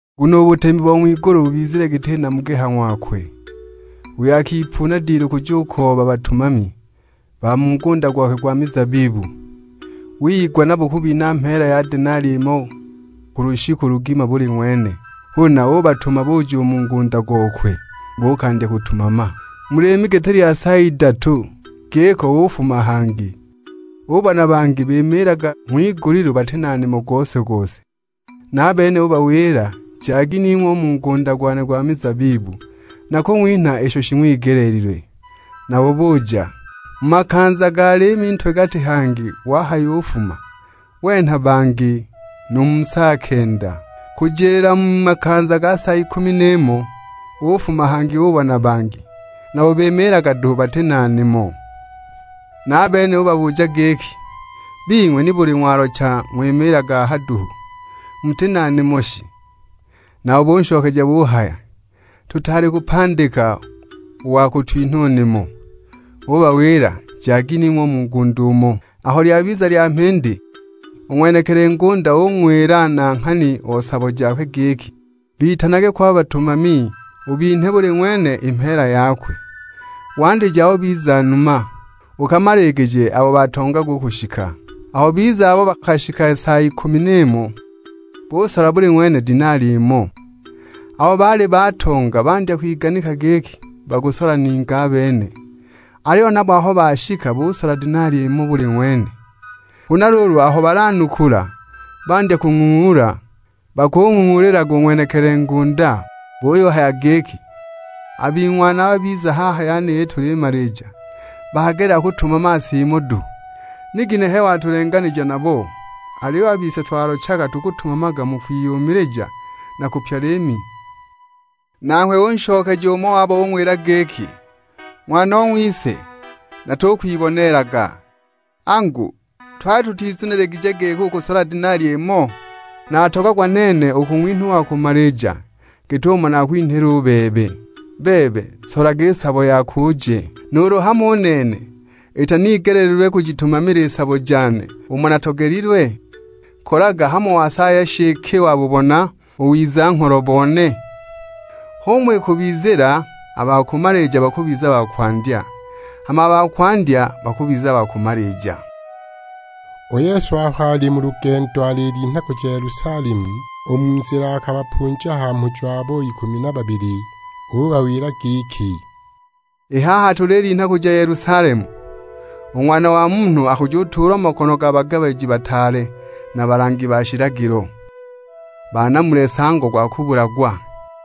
"Nguno u butemi bo ng'wigulu bubizile giti namugi ha ng'wakwe, uyo akipuuna dilu kujukooba batumami ba mu ngunda gwakwe gwa mizabibu. Wiyigwa nabo kubinha mheela ya denali imo ku lushiku lugima buli ng'wene. Huna ubatuma buja u mu ngunda gokwe, buukandya kutumama. Mu liimi giti lya sa idatu giko ufuma hangi, ubona bangi bimiilaga ng'wigulilu bati na nimo gose-gose. Na a bene ubawila; 'Jagi ning'we u mu ngunda gwane gwa mizabibu, nakung'winha isho shiigeleelilwe.' Nabo buja; mu makanza ga liimi ntwe-gati hangi wahayufuma, wenha bangi; nu mu sa kenda. Kujiliila mu makanza ga sa ikumi n'imo ufuma hangi ubona bangi, nabo bimiilaga duhu bati na nimo; na a bene ubabuja giki, 'Bing'we nibuli ng'walocha ng'wimiilaga aha duhu, muti na nimo shi?' Nabo bunshokeja buhaya, 'Tutaali kupandika u wa kutwinha u nimo.' Ubawila; 'Jagi ning'we u mu ngunda umo!' "Aho lyabiza lya mhindi, u ng'wenekili ngunda ung'wila nanghani o sabo jakwe giki, 'Bitanage ko a batumami ubinhe buli ng'wene i mheela yakwe; wandije abo biza numa, ukamaligije abo batongaga u kushika.' Aho biza abo bakashika sa ikumi n'imo, busola buli ng'wene denali imo. Abo baali batonga bandya kwiganika giki bakusola ningi a bene; aliyo nabo aho bashika busola denali imo buli ng'wene. Huna luulu aho balanukula, bandya kuyung'ung'uula, bakung'ung'uulilaga u ng'wenekili ngunda. Buyuhaya giki, 'A bing'wana aba biza haha yeniyi tulimalija, bagelela kutumama sa imo duhu, ni ginehe watulenganija nabo, aliyo a bise twalochaga tukutumamaga mu kwiyumilija na kupya liimi!' "Nanghwe unshokeja umo wabo ung'wila giki, 'Ng'wanong'wise, natukwiboneelaga. Angu, twali tutizuniligije giki ukusola denali imo? Natogagwa nene u kung'winha u wa kumalija git'umo nakwinhila u bebe. Bebe, solaga i sabo yako uje! Nuulu hamo u nene itanigeleelilwe kujitumamila i sabo jane umo natogelilwe? Kolaga hamo wasaaya shi iki wabubona u wiza-ngholo bone?' H'umo ikubizila; a ba kumalija bakubiza ba kwandya, hama a ba kwandya bakubiza ba kumalija!" U Yesu aho ali mu lugendo alilinha kuja Yelusalemu, u mu nzila akabapunja ha mhujo abo ikumi na babili; ubawila giki, "I haha tulilinha kuja Yelusalemu, u Ng'wana wa Munhu akujutuulwa mu makono ga bagabiji bataale na balangi ba shilagilo, banamule nsango gwa kubulagwa.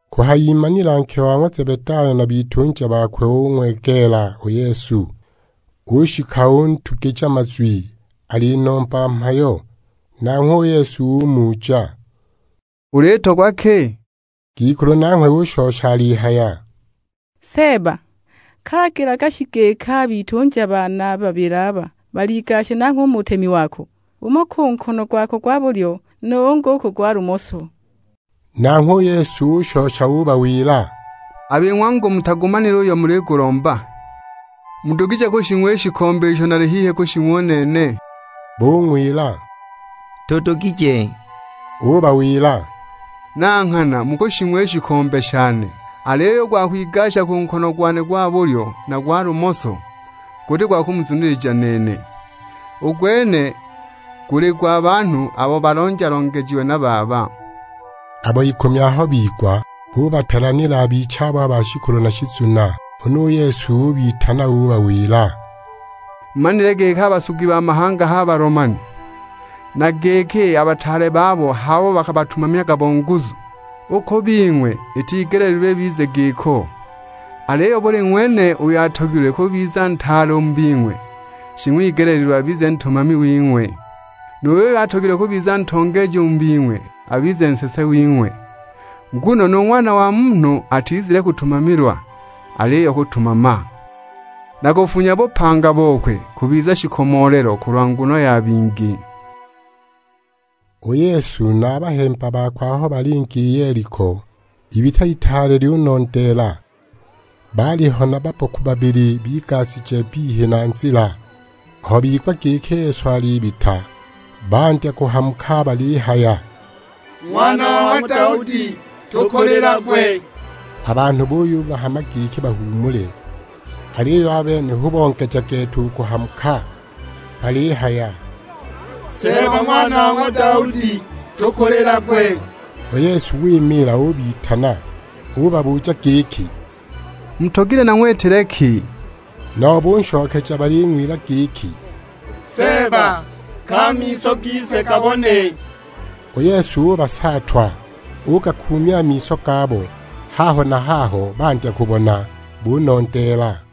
Kuhayimanila nke wa ng'wa Zebedayo na bitunja bakwe ong'wegeela u Yesu, ushika untugija mazwi alinomba mhayo. Nanghwe u Yesu umuja; "Ulitogwa ki?" Ngikulu nanghwe ushosha alihaya, "Seeba, ka lagilaga shi giki a bitunja bane a babili aba baligashe nangho u mu butemi wako, umo ku nkono gwako gwa bulyo, nu ungi u ku gwa lumoso!" Nanghwe u Yesu ushosha ubawila, "A bing'we angu mutagumanile uyo muligulomba! Mudugije kushing'wa i shikombe isho nali hihi kushing'wa u nene?" Bung'wila; "Tudugije!" Ubawila, "Na nghana mukushing'wa i shikombe shane; aliyo u gwa kwigasha ku nkono gwane gwa bulyo na gwa lumoso, guti gwa kumuzunilija nene; u gwene guli gwa banhu abo balonja-longejiwe na Baba." Abo ikumi aho bigwa, bubapelanila a bichabo a ba shikulu na shizuna. Huna u Yesu ubitana ubawila; "Mumanile giki a basugi ba mahanga h'a balomani, na giki a bataale babo h'abo bakabatumamyaga bo nguzu! U ku bing'we itigeleelilwe ibize giko, aliyo buli ng'wene uyo atogilwe kubiza ntaale u mu bing'we, shing'wigeleelilwe abize ntumami wing'we. Nu yuyo atogilwe kubiza ntongeeji u mu bing'we abize nsese wing'we. Nguno nu Ng'wana wa Munhu atizile kutumamilwa, aliyo kutumama, na kufunya bupanga bokwe kubiza shikomoolelo kulwa nguno ya bingi." U Yesu na a bahemba bakwe aho balinga i Yeliko, ibita itaale lyunondeela. Baaliho na babboku babili bigashije bbihi na nzila; aho bigwa giki Yesu alibita, bandya kuhamuka balihaya, "Ng'wana wa ng'wa Daudi, tukulilagwe!" A banhu buyubahama giki bahuumule, aliyo a bene hu bongeja gete u kuhamuka balihaya; "Seeba, Ng'wana wa ng'wa Daudi; tukulilagwe!" U Yesu wimiila ubitana. Ubabuja giki, "Mutogilwe nang'witile ki?" Nabo bunshokeja baling'wila giki, "Seeba, ka a miso gise gabone!" U Yesu ubasaatwa, ugakuumya a miso gabo; haho na haho bandya kubona, bunondeela.